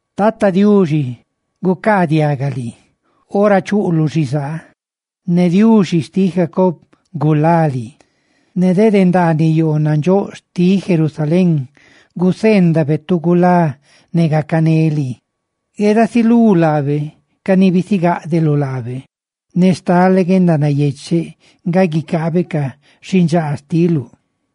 Tata Diuxi gucaadiaga liiora chuꞌluꞌ xizaa; ne Diuxi xtiꞌ Jacob gulá lii. Ne de ndaaniꞌ yoo nandxóꞌ xtiꞌ Sión guseendabe tu gulá ne gacané lii. Guedasilú laabe ca ni bisigáꞌdeluꞌ laabe, ne stale guendanayecheꞌ nga guicaabe ca xindxaa xtiluꞌ.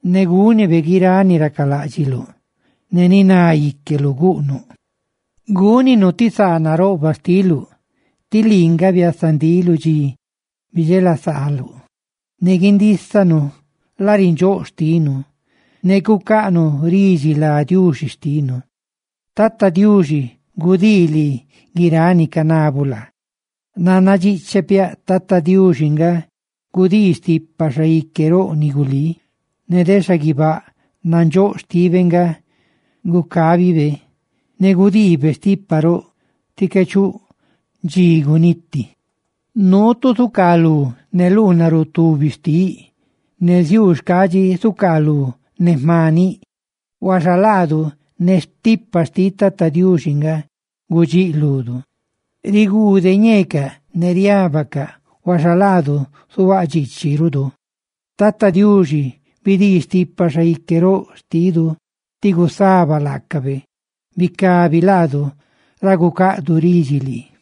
Ne gúnibe guiráꞌ ni racaláꞌdxiluꞌ ne ni ná íqueluꞌ guꞌnuꞌ. Gúninu ti saa naroꞌbaꞌ xtiluꞌ tí lii nga biasa ndiluꞌ dxi bidxelasaaluꞌ, ne guindísanu larindxóꞌa xtinu, ne gucaꞌnuꞌ ridxi lá Diuxi xtinu. ¡Tata Diuxi gudii lii guiráꞌ ni canabuꞌ laa! Nanna dxíꞌchepiaꞌ Tata Diuxi nga gudii stipa xaique roꞌ ni gulí; ne de xaguibáꞌ nandxóꞌ xtibe nga gucabibe, ne gudiibe stipa roꞌ tí qué chuꞌ dxi guniti. Nuu tu zucaaluꞌ ne luunarutubib xtiꞌ, ne ziuu xcaadxi zucaalú ne xmaniꞌ; huaxa laadu, ne stipa xtiꞌ Tata Diuxi nga gudxíꞌludu. Riguude ñeecaꞌ ne riábacaꞌ, huaxa laadu, zuhuáꞌ dxiichiꞌrudu. ¡Tata Diuxi, bidii stipa xaique roꞌ xtidu tí gusaba laacabe! ¡Bicabi laadu ra gucaꞌdu ridxi lii!